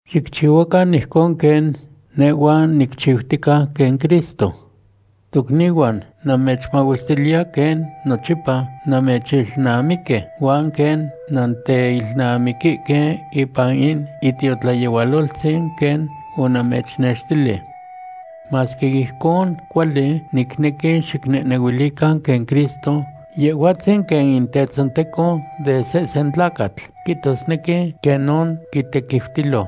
Xicchihuacan ijcon quen nehhua nicchiutica quen Cristo. Tocnihuan, namechmahuestiliya quen nochipa nannechilnamiquihque huan quen nannentinemihque ipan in itiotlayehualoltzin quen onamechnextili. Masque ijcon cuali, nicnequi xicnehnehuilican quen Cristo, Yehhuatzin quen in tetzonteco de sehsen tlacatl, quihtosnequi quenon quitequiutilo.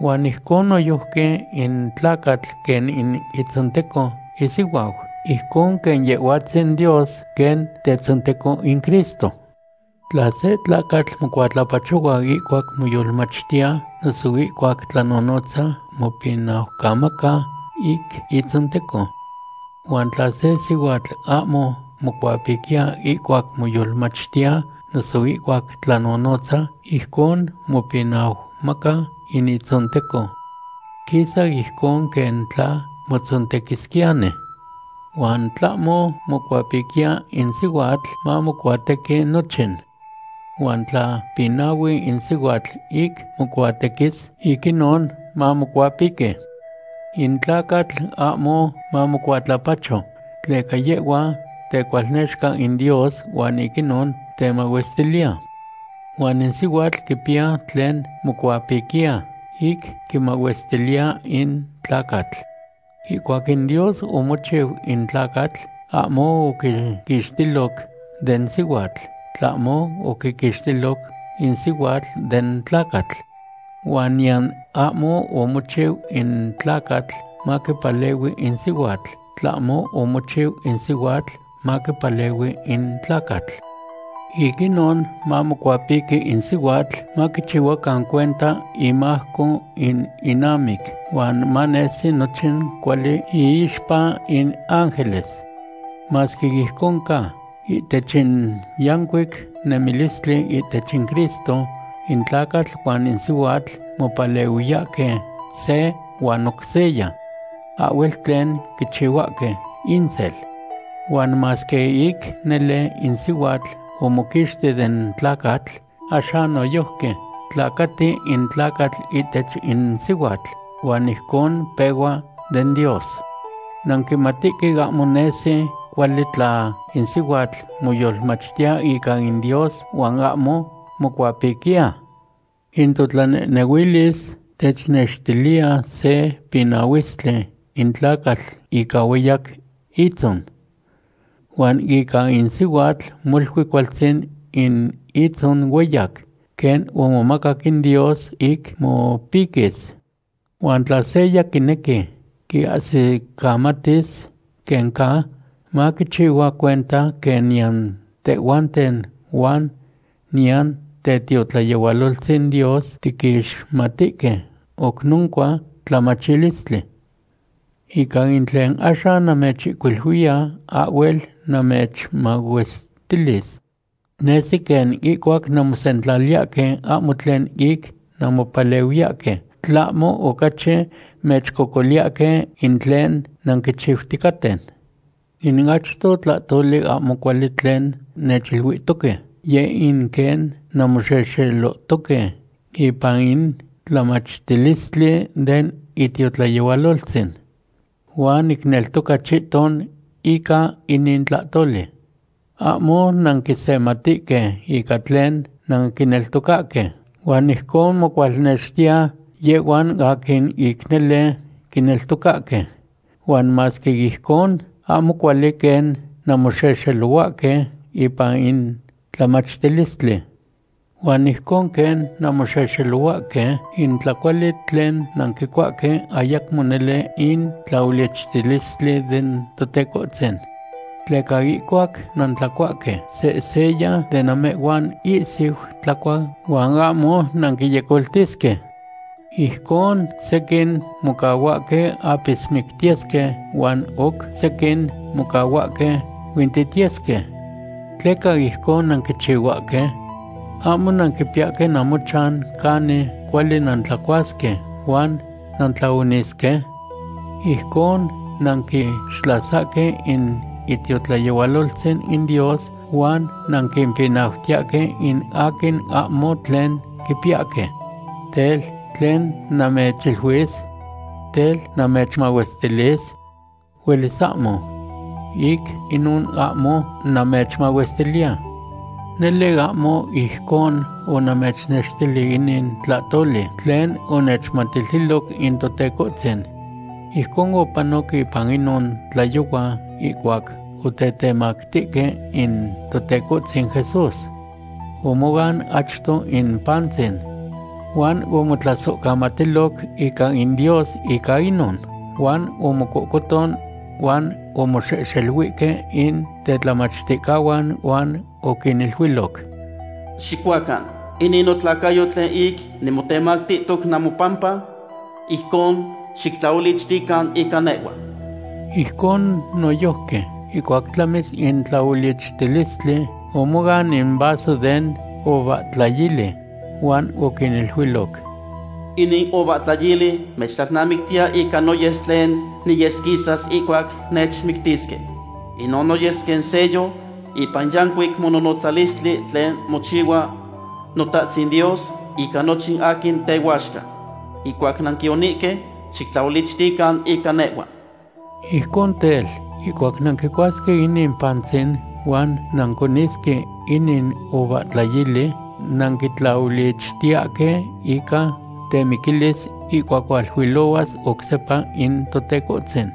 Huan ijcon noyojqui in tlacatl quen in itzonteco isihuau, ijcon quen Yehhuatzin Dios quen Tetzonteco in Cristo. Tla se tlacatl mocuatlapachohua ihcuac moyolmachtiya, noso ihcuac tlanonotza, mopinaucamaca ic itzonteco. Huan tla se sihuatl ahmo mocuapiquiya ihcuac moyolmachtiya noso ihcuac tlanonotza, ijcon mopinaucamaca in itzonteco. Quisa ijcon quen tla motzontequisquiyani. Huan tlahmo mocuapiquiya in sihuatl, mamocuatequi nochin. Huan tla pinahui in sihuatl ic mocuatequis, ic inon mamocuapiqui. In tlacatl ahmo mamocuatlapacho, tleca yehhua tecualnexca in Dios huan ic inon temahuestiliya. Huan in sihuatl quipiya tlen mocuapiquiya ic quimahuestiliya in tlacatl. Ihcuac in Dios omochiu in tlacatl, ahmo oquiquixtiloc den sihuatl, tlahmo oquiquixtiloc in sihuatl den tlacatl. Huan niyan ahmo omochiu in tlacatl maquipalehui in sihuatl, tlahmo omochiu in sihuatl maquipalehui in tlacatl. Ic inon mamocuapiqui in sihuatl maquichihuacan cuenta imajco in inamic huan manesi nochin cuali iixpa in ángeles. Masque ijcon ca, ihtech in yancuic nemilistli ihtech in Cristo, in tlacatl huan in sihuatl mopalehuiyahque se huan oc seya. Ahhuel tlen quichihuahque insel. Huan masque ic nele in sihuatl omoquixti den tlacatl, axan noyojqui tlacati in tlacatl ihtech in sihuatl, huan ijcon pehua den Dios. Nanquimatihque ahmo nesi cuali tla in sihuatl moyolmachtiya ica in Dios huan ahmo mocuapiquiya. In totlanehnehuilis technextiliya se pinahuistli in tlacatl ica hueyac itzon. Huan ica in sihuatl molui cualtzin in itzon hueyac, quen omomacac in Dios ic mopiquis. Huan tla seya quinequi quiahsicamatis quen ca, maquichihua cuenta quen niyan tehhuanten huan niyan tetiotlayehualoltzin Dios tiquixmatihque oc noncua tlamachilistli. Ica in tlen axan namechihcuiluiya, ahhuel namechmahuestilis. Nesi quen ihcuac namosentlaliyahque ahmo tlen ic nanmopalehuiyahque, tlahmo ocachi mechcocoliyahque in tlen nanquichiuticaten. In achto tlahtoli ahmo cuali tlen nechiluihtoque, yeh in quen nanmoxexelohtoque ipan in tlamachtilistli den itiotlayehualoltzin. Huan nicneltoca chihton ica inin tlahtoli. Ahmo nanquisematihque ica tlen nanquineltocahque huan ijcon mocualnextiya yehhuan aquin ic nele quineltocahque. Huan masque ijcon, ahmo cuali quen nanmoxexelohuahque ipan in tlamachtilistli. Huan ijcon quen nanmoxexelohuahque, in tlacuali tlen nanquicuahque ayacmo nele in tlaolichtilistli den Totecohtzin. Tleca ihcuac nantlacuahque, sehseya de namehhuan ihsihui tlacua huan ahmo nanquinyecoltisque. Ijcon sequin mocahuahque apismictiyesque huan oc sequin mocahuahque huintitiyesque. ¿Tleca ijcon nanquichihuahque? ¿Ahmo nanquipiyahque namochan canin cuali nantlacuasque huan nantlaonisque? Ijcon nanquixtlasahque in itiotlayehualoltzin in Dios huan nanquimpinautiyahque in aquin ahmo tlen quipiyahque. Tel, ¿tlen namechiluis? Tel, ¿namechmahuestilis? Huelis ahmo. Ic inon ahmo namechmahuestiliya. Nele ahmo ijcon onamechnextili inin tlahtoli tlen onechmatiltiloc in Totecohtzin. Ijcon opanoc ipan inon tlayohua ihcuac otetemactihque in Totecohtzin Jesús. Omoan achto in pantzin. Huan omotlasohcamatiloc ica in Dios ica inon, huan omococohton huan omoxehxeluihque in tetlamachticahuan huan oquiniluiloc: “Xicuacan, inin notlacayo tlen ic nimotemactihtoc namopampa. Ijcon xictlaolichtican ica nehhua.” Ijcon noyojqui, ihcuac tlamis in tlaolichtilistli, omoan in vaso den uvahtlayili huan oquiniluiloc: “Inin uvahtlayili mechtlalnamictiya ica noyes tlen niyesquisas ihcuac nechmictisque. Inon noyes quen sello ipan in yancuic mononotzalistli tlen mochihua Notahtzin Dios ica nochin aquin tehuaxca. Ihcuac nanquionihque, xictlaolichtican ica nehhua.” Ijcon tel, ihcuac nanquicuasque inin pantzin huan nanconisque inin uvahtlayili, nanquitlaolichtiyahque ica temiquilis ihcuac hualuilohuas oc sepa in Totecohtzin.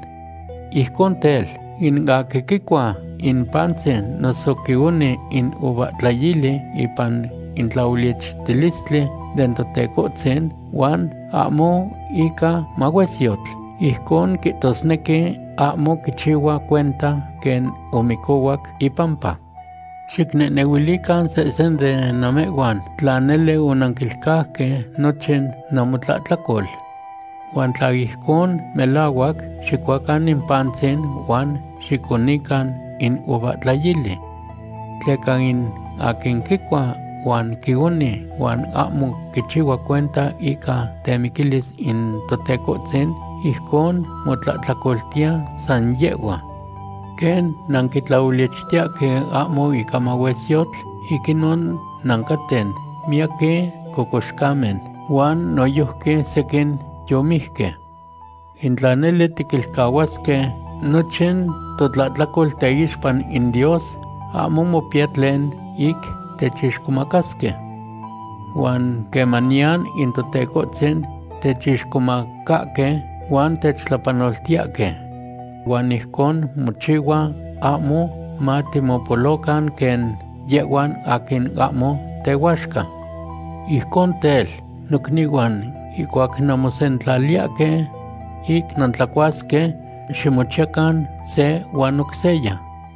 Ijcon tel, in aquin quicua in pantzin noso quioni in uvahtlayili ipan in tlaolichtilistli den Totecohtzin huan ahmo ica mahuesyotl, ijcon quihtosnequi ahmo quichihua cuenta quen omicohuac ipampa. Xicnehnehuilican sehsen de namehhuan tla nele onanquilcauque nochin namotlahtlacol. Huan tla ijcon melahuac, xicuacan in pantzin huan xiconican in uvahtlayili. Tleca in aquin quicua huan quioni huan ahmo quichihua cuenta ica temiquilis in Totecohtzin, ijcon motlahtlacoltiya san yehhua. Quen nanquitlaolichtiyahque ahmo ica mahuesyotl, ic inon nancaten miaqui cocoxcamen huan noyojqui sequin yomijque. In tla nele tiquilcahuasque nochin totlahtlacol teixpa in Dios, ahmo mopiya tlen ic techixcomacasque. Huan quemaniyan in Totecohtzin techixcomacahque, huan techtlapanoltiyahque. Huan ijcon mochihua ahmo matimopolocan quen yehhuan aquin ahmo tehuaxca. Ijcon tel, nocnihuan, ihcuac nanmosentlaliyahque ic nantlacuasque, ximochiyacan se huan oc seya.